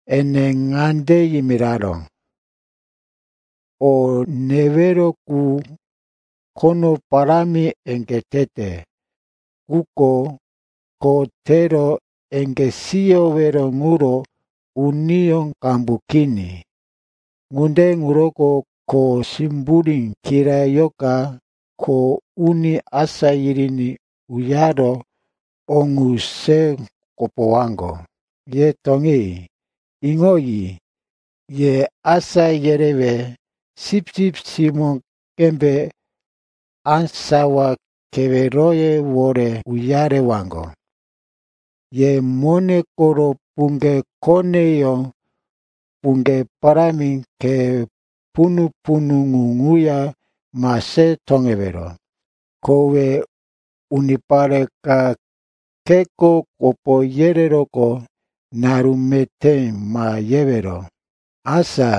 Ene ŋande yimiraró, “O newero qu khono parámi eŋgé tete, quko kho tero eŋgé siyowero ŋuro uniyó qambu kini. Ŋunde ŋuroko kho simburí kirayoka kho uni asá yiriní uyaro o ŋu se kopowaŋgo. Ye toŋi. Iŋoyi, ye asá yerewe sipsip simó qembe á sawa keweroyewore uyarewaŋgo. Ye mone koro puŋge koneyó, puŋge parámi, khe punu-punu ŋu ŋuya ma se toŋewero. Kowe unipare ka kheko kopo yereroqo naru meté ma yewero. “Asa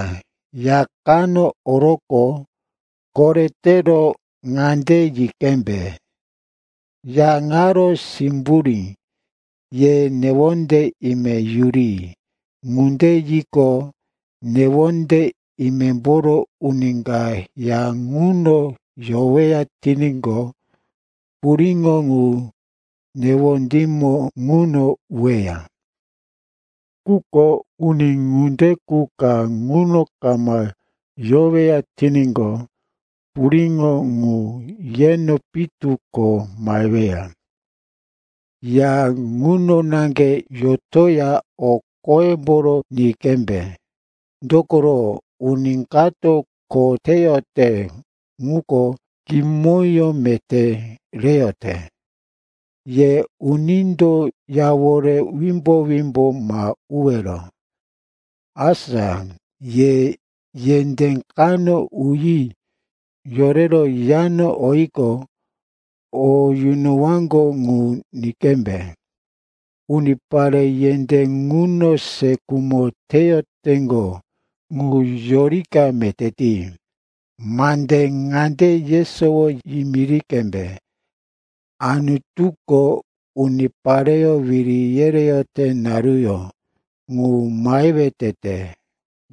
ya kano oroqo, koretero ŋande yi qembe, ‘Ya ŋaro simburí, ye newonde ime yuri.’ Ŋunde yiqo, newonde imemboro uni ka ya ŋuno yoweya tiníqo, puriŋo ŋu newondímo ŋuno uweya. Quko uni ŋunde qu ka ŋuno kama yoweya tiníqo, puriŋo ŋu yeno pitu ko maheweya. Ya ŋuno naŋge yotoya o qoyemboro ni qembe. Dokoro uni kato kho teyote ŋuko kimoyó meté reyote. Ye unindo yawore wimbo-wimbo ma uwero. “Asa ye yendé kano uyi yorero yano oyiqo, o yunowaŋgo ŋu ni qembe. Unipare yendé ŋuno se khumo teyoteŋgo ŋu yorika meté ti. Mande ŋande yesowo yimiri qembe, ‘Anutuko unipareyó wiri yereyote naruyó ŋu mahewe tete.’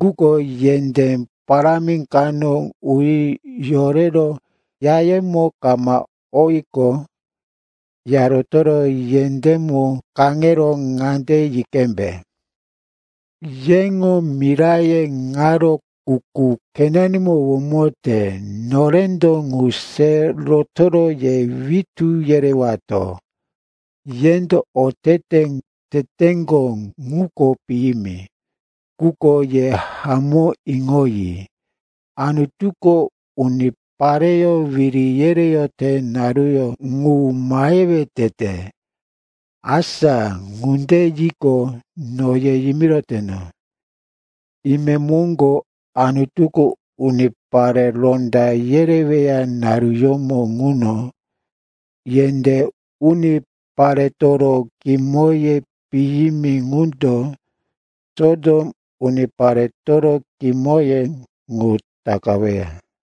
Quko yendé parámi kano uyi yorero yayemo kama oyiqo, ya rotoro yendémo kaŋero ŋande yi qembe, ‘Yeŋo miraye ŋaro kuku khenanimo womote. Norendo ŋu se rotoro ye witú yerewato, yendo otete ŋu teteŋgo ŋuko piyimi. Quko ye hamó iŋoyi, Anutuko unipareyó wiri yereyote naruyó ŋu mahewe tete.’ Asa ŋunde yiqo, no ye yimiroteno, imemoŋgo Anutuko unipare ronda yereweya naruyómo ŋuno yendé uniparetoro kimoye piyimi ŋundo Sotom uniparetoro kimoye ŋu takaweya.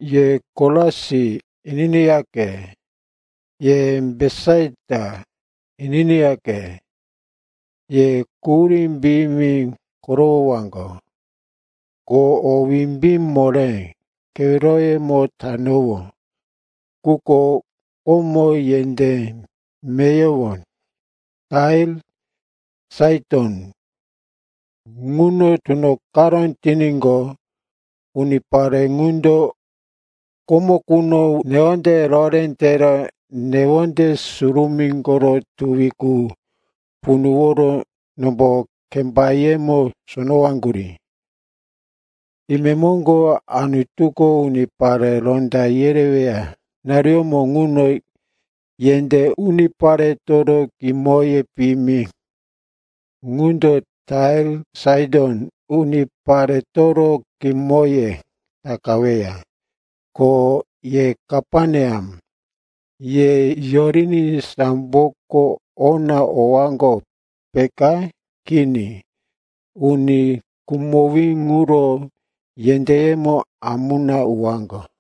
“Ye Korasin, ininiyaqe, ye Betisaita, ininiyaqe. Ye quhurí piyimi korowowaŋgo. Ko o wimbí moré keweroyemo tanowó ŋuko komo yendé meyowo Tair, Saiton ŋuno tunoqaró tiníqo, unipare ŋundo komo quno newonde rohoré tero newonde surumí koro tuwi qu punuworo nombo kembayemo sonowaŋgurí. Imemoŋgo Anutuko unipare ronda yereweya naruyómo ŋuno yendé uniparetoro kimoye piyimi ŋundo Tair, Saiton uniparetoro kimoye takaweya. Ko ye Kaperneam, ye yoriní samboko ona owaŋgo, peka? Kini, uni khumowí ŋuro yendéyemo amuna uwaŋgo.”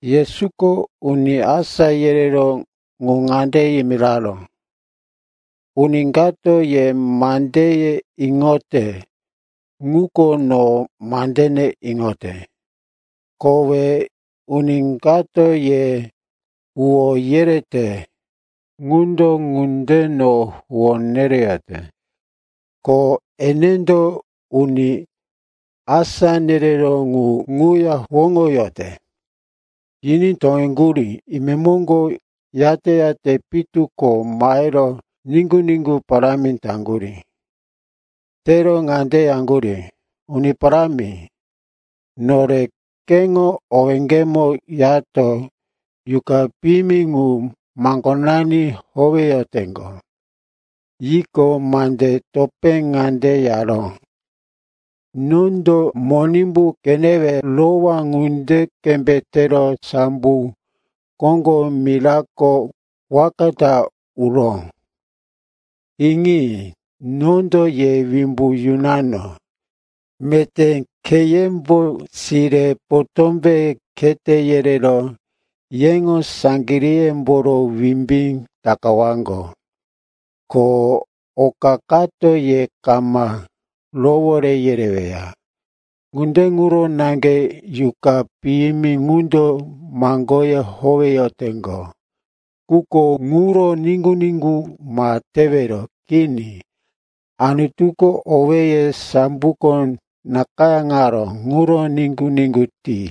Yesuko uni asá yereró ŋu ŋande yimiraró, “Uni kato ye mandeye iŋote, ŋuko no mandene iŋote. Kowe uni kato ye huwó yereyote qundo ŋunde no huwó nereyote, ko enendo uni asá nereró ŋu ŋuya huwóŋoyote.” Yiní toŋeŋgurí. Imemoŋgo yate-yate pitu ko mahero niŋgu-niŋgu parámi taŋgurí. Tero ŋande yaŋgurí, “Uni Parámi, nore keŋo owéŋgemo yato yuqa piyimi ŋu maŋgonani howeyoteŋgo.” Yiqo, mande topé ŋande yaró, “Nondo Monimbu qenewe rowá ŋunde qembe tero sambo koŋgo mirako waka ta uró. Iŋi, nondo ye wimbu yunano, meté kheyembo sire, potómbe khete yerero yeŋo saŋgiríyemboro wimbí takawaŋgo. Ko oka kato ye kama rowore yereweya. Ŋunde ŋuro naŋge yuqa piyimi ŋundo maŋgoye howeyoteŋgo, quko ŋuro niŋgu-niŋgu ma tewero. Kini. Anutuko owéye samboko nakayáŋaró ŋuro niŋgu-niŋgu ti.”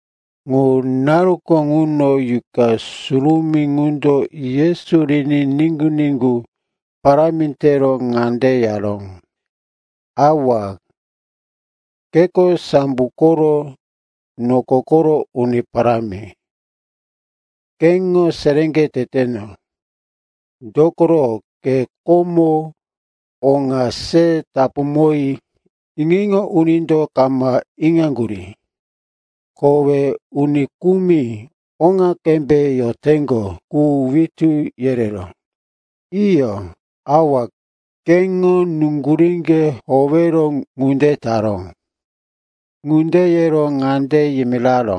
Ŋu naruko ŋuno Yuqa Surumí ŋundo Yesu riní niŋgu-niŋgu parámi tero ŋande yaró, “Awa, keko sambo koro, noko koro Uni Parámi. Keŋo seréŋge teteno, dokoro ke komo o ŋa se tapuŋoyi iŋo-iŋo unindo kama iŋaŋgurí. Kowe uni kumi oŋa qembe yoteŋgo qu witú yereró. Iyo, Awa, keŋo nuŋguríŋge howero ŋunde taró.” Ŋunde yero ŋande yimiraró,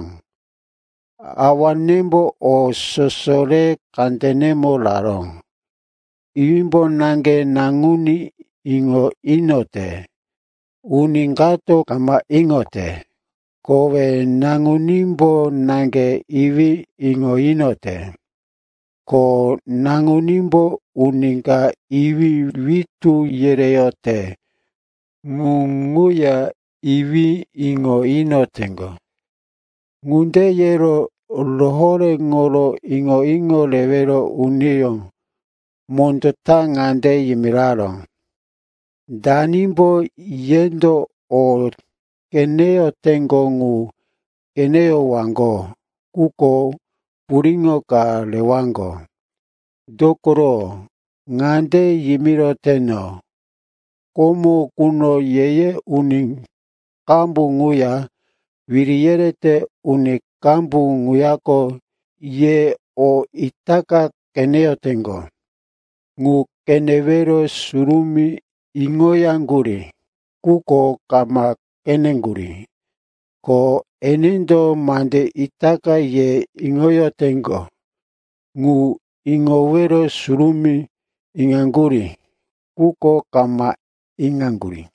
“Awanembo o soso re kandenemo raró. Iwímbo naŋge Naŋuní iŋo inoyote, uni kato kama iŋote. Kowe Naŋunímbo naŋge Iwí iŋo inoyote, ko Naŋunímbo uni ka Iwí witú yereyote ŋu ŋuya Iwí iŋo inoteŋgo.” Ŋunde yero rohoréŋoro iŋo-iŋo rewero uniyó mondó ta ŋande yimiraró, “Danimbo yendo o qeneyoteŋgo ŋu qeneyowaŋgo ŋuko puriŋo ka rewaŋgo. Dokoro ŋande yimiroteno, komo quno ye-ye uni qambu ŋuya wiri yerete uni qambu ŋuyako ye o itaka qeneyoteŋgo ŋu qenewero surumí iŋoyaŋgurí, quko kama qeneŋgurí. Ko enendo mande itaka ye iŋoyoteŋgo ŋu iŋowero surumí iŋoyaŋgurí, quko kama iŋaŋgurí.”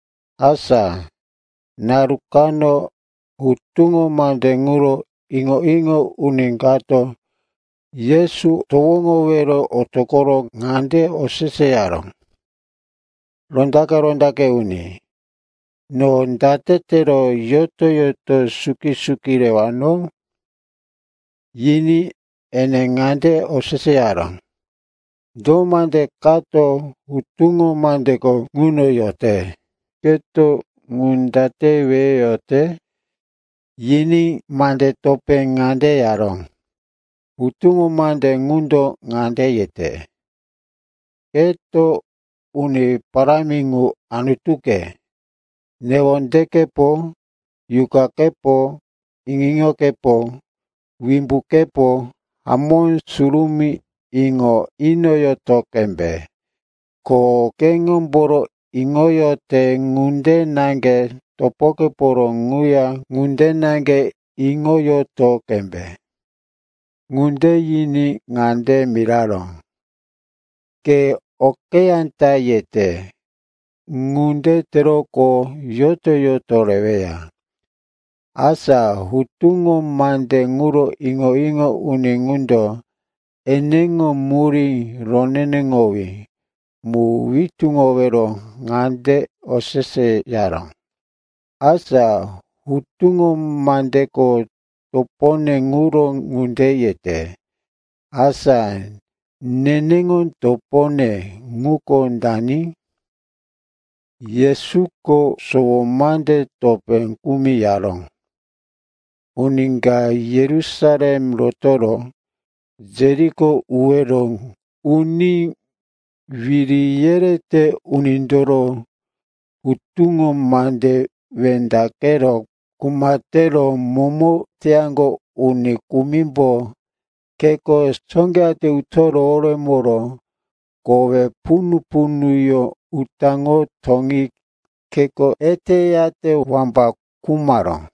Asa naru kano hutuŋo mande ŋuro iŋo-iŋo uni kato Yesu towoŋowero otoqoro ŋande oseseyaró, “Rondaqe-rondaqe uni, no date tero yoto-yoto suki-suki rewano?” Yiní ene ŋande oseseyaró, “Do mande kato hutuŋo mandeko ŋuno yote? Keto ŋu date weyoyote?” Yiní mande topé ŋande yaró, “Hutuŋo mande ŋundo ŋande yete, ‘Keto Uni Parámi ŋu, Anutuke, newondekepo, yuqakepo, iŋo-iŋokepo, wimbukepo hamó surumí iŋo inoyoto qembe.’ Ko ‘keŋomboro iŋoyote ŋunde naŋge topokeporo ŋuya ŋunde naŋge iŋoyoto qembe.’” Ŋunde yiní ŋande miraró, “Ke okeyá ta yete. Ŋunde teroqo yoto-yoto reweya.” Asa hutuŋo mande ŋuro iŋo-iŋo uni ŋundo eneŋo murí roneneŋowí mu witúŋowero ŋande oseseyaró, “Asa hutuŋo mandeko topone ŋuro ŋunde yete. Asa neneŋo topone ŋuko dani?” Yesuko sowo mande topé kumi yaró, “Uni ka Yerusalem rotoro Jeriko uwero uní wiri yerete unindoro hutuŋo mande wendaqero kuma tero momo teyaŋgo uni kumimbo kheko sóqeyate uto roworemoro kowe punu-punuyó utaŋo toŋi kheko eteyate wambaka khumaró.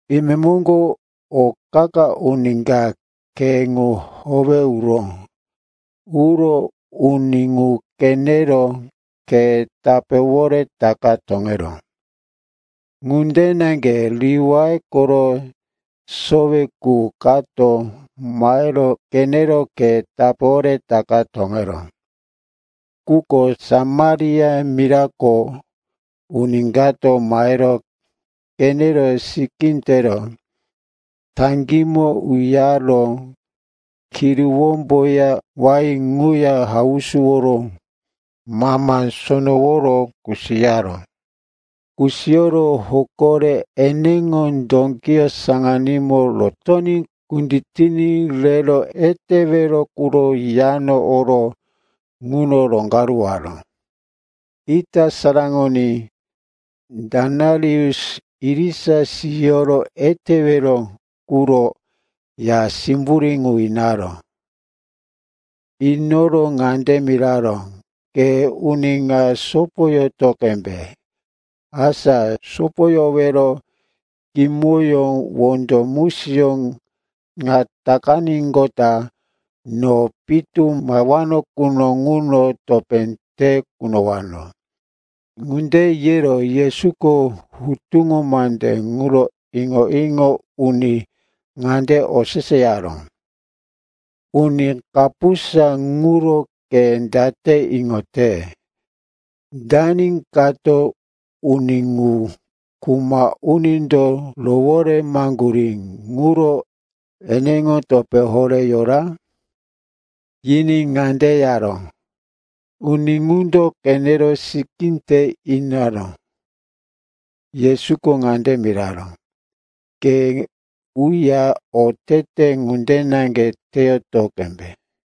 Imemoŋgo o qa-qa uni ka khe ŋu howe uró. Uro uni ŋu qenero khe tapéwore takaro toŋeró. Ŋunde naŋge Liwai koro sowe qu kato mahero qenero khe tapéwore takaro toŋeró. Quko Samaria mirako uni kato mahero qenero sikí tero taŋgímo uyaro, kiruwómboya wain ŋuya hausuworo mama sonoworo kusiyaró. Kusiyoro hoko re eneŋo dókiyó saŋano rotoní kunditiní rero etewero quro yano oro ŋuno roŋgaruwaró. Ita saraŋoní denarius irisa siyoro etewero quro ya simburí ŋu inaró. Inoro ŋande miraró, ‘Ke uni ŋa sopoyoto qembe. Asa sopoyowero kimoyó wondo musiyó ŋa takaníqota, no pitu mahewano quno ŋuno topé te kunowano.’” Ŋunde yero Yesuko hutuŋo mande ŋuro iŋo-iŋo uni ŋande oseseyaró, “Uni kapusa ŋuro ke date iŋote, dani kato uni ŋu kuma unindo roworemaŋgurí ŋuro eneŋo topé horé yora?” Yiní ŋande yaró, “Uni ŋundo qenero sikí te inaró.” Yesuko ŋande miraró, “Ke uya otete ŋunde naŋge teyoto qembe.”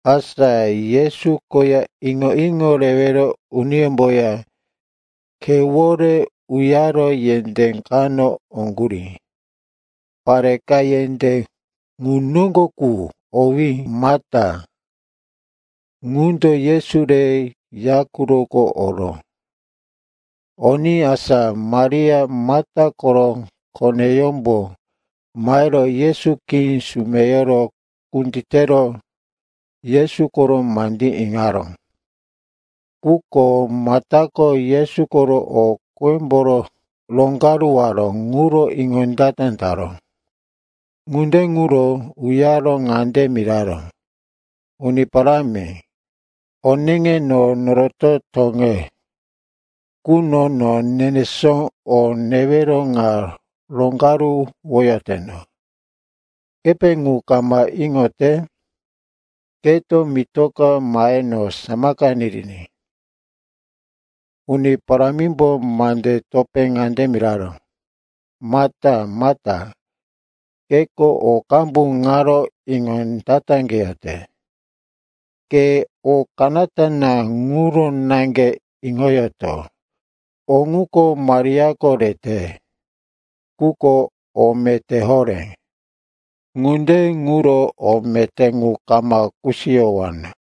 Asa Yesu koya iŋo-iŋo rewero uniyómboya khewore uyaro yendé kano oŋgurí. Pare ka yendé ŋu noŋgo qu, owí Mata, ŋundo Yesu re yayó quroko oró. Oní asa Maria, Mata koro koneyómbo mahero Yesu khí sumeyoro kunditero Yesu koro mandí iŋaró. Quko Matako Yesu koro o qímboro roŋgaruwaró ŋuro iŋondata taró. Ŋunde ŋuro uyaro ŋande miraró, “Uni Parámi, oneŋe no noroto toŋe quno no nenesó o newero ŋa roŋgaruwoyoteno. Kepe ŋu kama iŋoyote? Keto mitoka mahe no samaka niriní.” Uni Parámimbo mande topé ŋande miraró, “Mata, Mata, keko o qambu ŋaro iŋondataqeyote. Ke o kanata na ŋuro naŋge iŋoyoto. O ŋuko Mariako rete, ŋuko o meté horé, ŋunde ŋuro o meté ŋu kama kusiyowano.”